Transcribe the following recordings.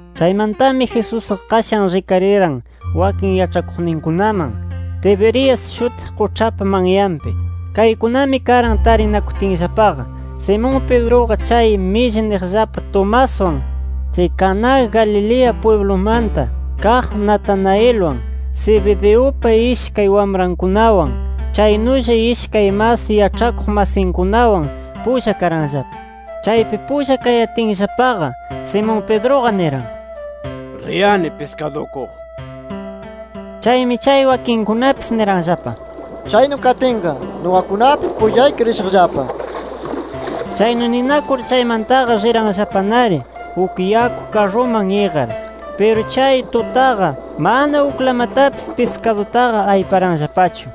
Chaymantami, Jesusqa qashan rikariran wakin yaĉhakuqninkunaman, Tiberias shutiq quĉhapa manyanpi. Kaykunami karan tarinakutinllapaqa: Simón Pedruqa chay Milli niqllapa Tomaswan, chay Caná Galilea pwiblumanta kaq Natanaelwan, Zebedeupa ishkay wamrankunawan, chaynulla ishkay mas yaĉhakuq masinkunawan pulla karanllapa. Chaypi pulla kayatinllapaqa, Simón Pedruqa niran: —Riyani piskadukuq, nir. Chaymi chay wakinkunapis niranllapa: —Chaynu katinqa nuqakunapis pullayki rishaqllapa nir. Chaynu ninakur chaymantaqa riranllapanari uk yaku karruman iqar. Piru chay tutaqa mana uklamatapis piskadutaqa ayparanllapachu.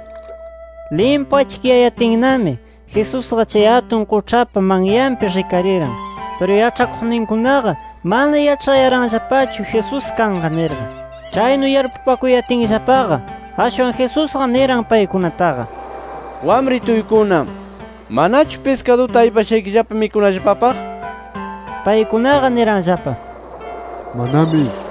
Limpu achkiyayatinnami, Jesusqa chay atun quĉhapa manyanpi rikariran. Piru yaĉhakuqninkunaqa mana yaĉhayaranllapachu, Jesús kanqa nirqa. Chaynu yarpupakuyatinllapaqa, ashwan Jesusqa niran paykunataqa: —Wamrituykuna, ¿manachu piskaduta aypashaykillapa mikunallapapaq? nir. Paykunaqa niranllapa: —Manami nir.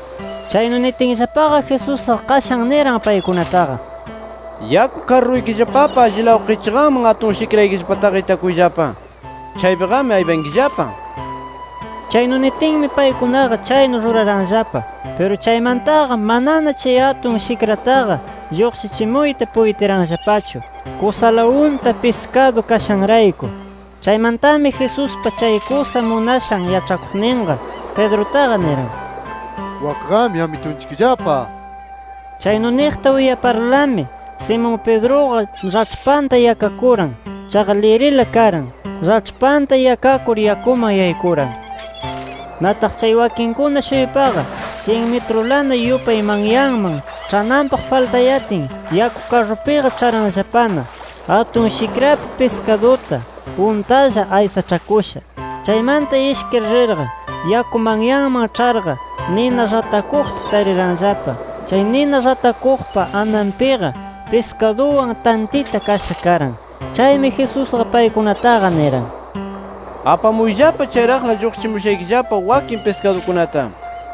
Chaynu nitinllapaqa, Jesusqa qashan niran paykunataqa: —Yaku karruykillapapa allilaw qichqanman atun shikraykillapataqa itakuyllapa. Chaypiqami aypankillapa nir. Chaynu nitinmi, paykunaqa chaynu ruraranllapa. Piru chaymantaqa manana chay atun shikrataqa lluqshichimuyta puytiranllapachu, kusala unta piskadu kashanrayku. Chaymantami Jesuspa chay kusa munashan yaĉhakuqninqa, Pedrutaqa niran: —¡Wakqami Amitunchikllapa! nir. Chaynu niqta uyaparlami Simón Pedruqa raĉhpanta yakakuran. Chaqa lirila karan. Raĉhpanta yakakur yakuman yaykuran. Nataq chay wakinkuna-shuypaqa, syin mitrulana yupay manyaman ĉhananpaq faltayatin, yaku karrunpiqa ĉharanllapana, atun shikrapi piskaduta untalla aysaĉhakusha. Chaymanta ishkir rirqa yaku manyaman ĉharqa nina ratakuqta tariranllapa. Chay nina ratakuqpa ananpiqa piskaduwan, tantita kasha karan. Chaymi Jesusqa paykunataqa niran: —Apamuyllapa chayraqla lluqshichimushaykillapa wakin piskadukunata nir.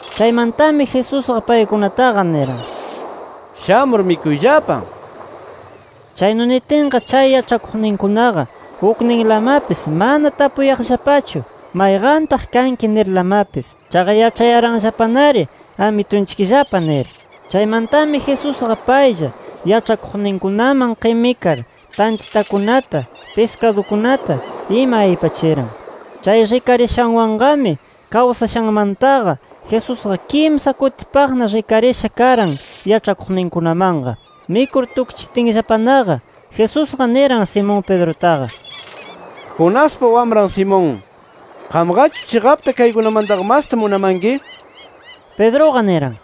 Chaymantami Jesusqa, paykunataqa niran: —Shamur mikuyllapa nir. Chaynu nitinqa chay yaĉhakuqninkunaqa ukninlamapis mana tapuyaqllapachu, mayqantaq kanki nirlamapis. Chaqa yaĉhayaranllapanari Amitunchikllapa nir. Chaymantami Jesusqa paylla yaĉhakuqninkunaman qimikar tantitakunata, piskadukunata ima aypachiran. Chay rikarishanwanqami kawsashanmantaqa Jesusqa kimsa kutipaqna rikarisha karan yaĉhakuqninkunamanqa. Mikur tukchitinllapanaqa, Jesusqa niran Simón Pedrutaqa: —Jonaspa wamran Simón. ¿Qamqachu chiqapta kaykunamantaqa masta munamanki? Pedruqa niran: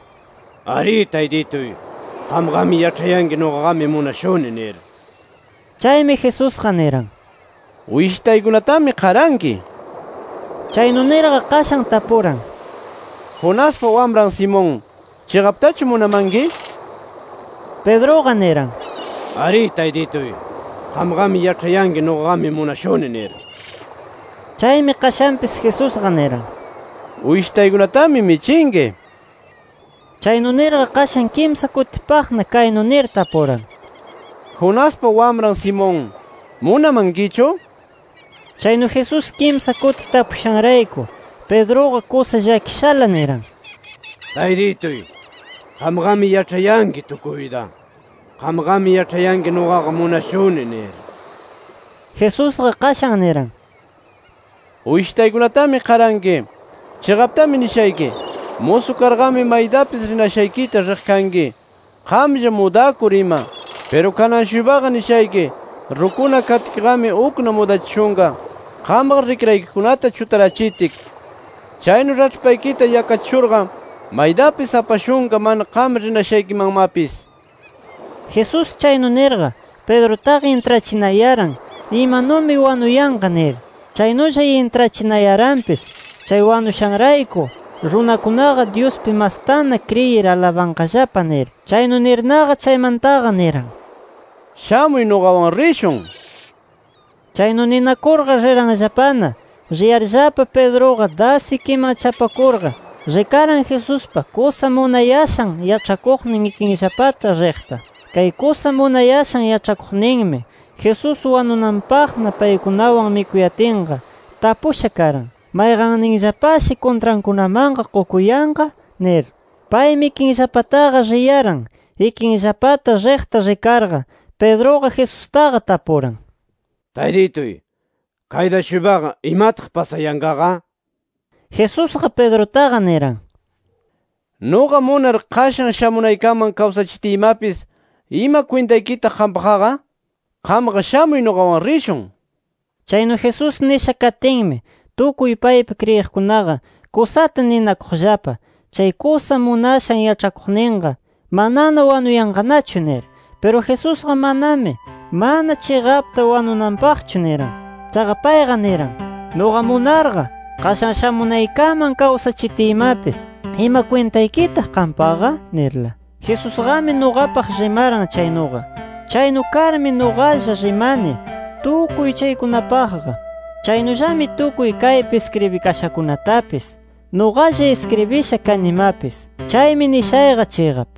—Arí Taytituy. Qamqami yaĉhayanki nuqaqami munashuni nir. Chaymi Jesusqa niran: —Uyshitaykunatami qaranki nir. Chaynu nirqa, qashan tapuran: —Jonaspa wamran Simón, ¿chiqaptachu munamanki? nir. Pedruqa niran: —Arí Taytituy. Qamqami yaĉhayanki nuqaqami munashuni nir. Chaymi qashanpis Jesusqa niran: —Uyshitaykunatami michinki nir. Chaynu nirqa qashan kimsa kutipaqna kaynu nir tapuran: —Jonaspa wamran Simón ¿munamankichu? nir. Chaynu Jesús kimsa kuti tapushanrayku, Pedruqa kusa llakishala niran: —Taytituy, qamqami yaĉhayanki tukuyta. Qamqami yaĉhayanki nuqaqa munashuni nir. Jesusqa qashan niran: —Uyshitaykunatami qaranki nir. Chiqaptami nishayki: Musu karqami maytapis rinashaykita riq kanki, qamlla mudakur ima. Piru kanan-shuypaqa nishayki: Rukuna katkiqami, ukna mudachishunqa, qamqa rikraykikunata chutarachitki. Chaynu raĉhpaykita yakachishurqa, maytapis apashunqa mana qam rinashaykimanmapis. Jesús chaynu nirqa, Pedrutaqa intrachinayaran imanumi wanuyanqa nir. Chaynulla intrachinayaranpis chay wanushanrayku, runakunaqa Dyuspi mastana kriyir alabanqallapa nir. Chaynu nirnaqa chaymantaqa niran: —¡Shamuy nuqawan rishun! nir. Chaynu ninakurqa riranllapana. Riyarllapa Pedruqa das ikinman chapakurqa, rikaran Jesuspa kusa munayashan yaĉhakuqnin ikinllapata riqta. Kay kusa munayashan yaĉhakuqninmi Jesús wanunanpaqna paykunawan mikuyatinqa, tapusha karan “¿Mayqanninllapashi kuntrankunamanqa qukuyanqa?” nir. Paymi ikinllapataqa riyaran. Ikinllapata riqta rikarqa, Pedruqa Jesustaqa tapuran: —Taytituy, kayta-shuypaqa, ¿imataq pasayanqaqa? nir. Jesusqa Pedrutaqa niran: —Nuqa munar, qashan shamunaykaman kawsachitiymapis, ¿ima kwintaykitaq qampaqqa? Qamqa shamuy nuqawan rishun nir. Chaynu Jesús nisha katinmi, tukuy paypi kriyiqkunaqa kusata ninakuqllapa: “Chay kusa munashan yaĉhakuqninqa manana wanuyanqanachu” nir. Piru Jesusqa manami, mana chiqapta wanunanpaqchu niran. Chaqa payqa, niran: “Nuqa munarqa, qashan shamunaykaman kawsachitiymapis, ¿ima kwintaykitaq qampaqa?” nirla. Jesusqami nuqapaq rimaran chaynuqa. Chaynu karmi nuqalla rimani tukuy chaykunapaqqa. Chaynullami tukuy kaypi iskribikashakunatapis nuqalla iskribisha kanimapis. Chaymi nishayqa chiqap.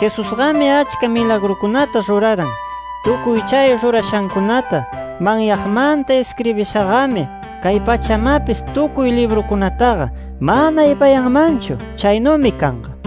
Jesusqami achka milagrukunata ruraran. Tukuy chay rurashankunata manyaqmanta iskribishaqami kay pachamapis tukuy librukunataqa mana aypayanmanchu. Chaynumi kanqa.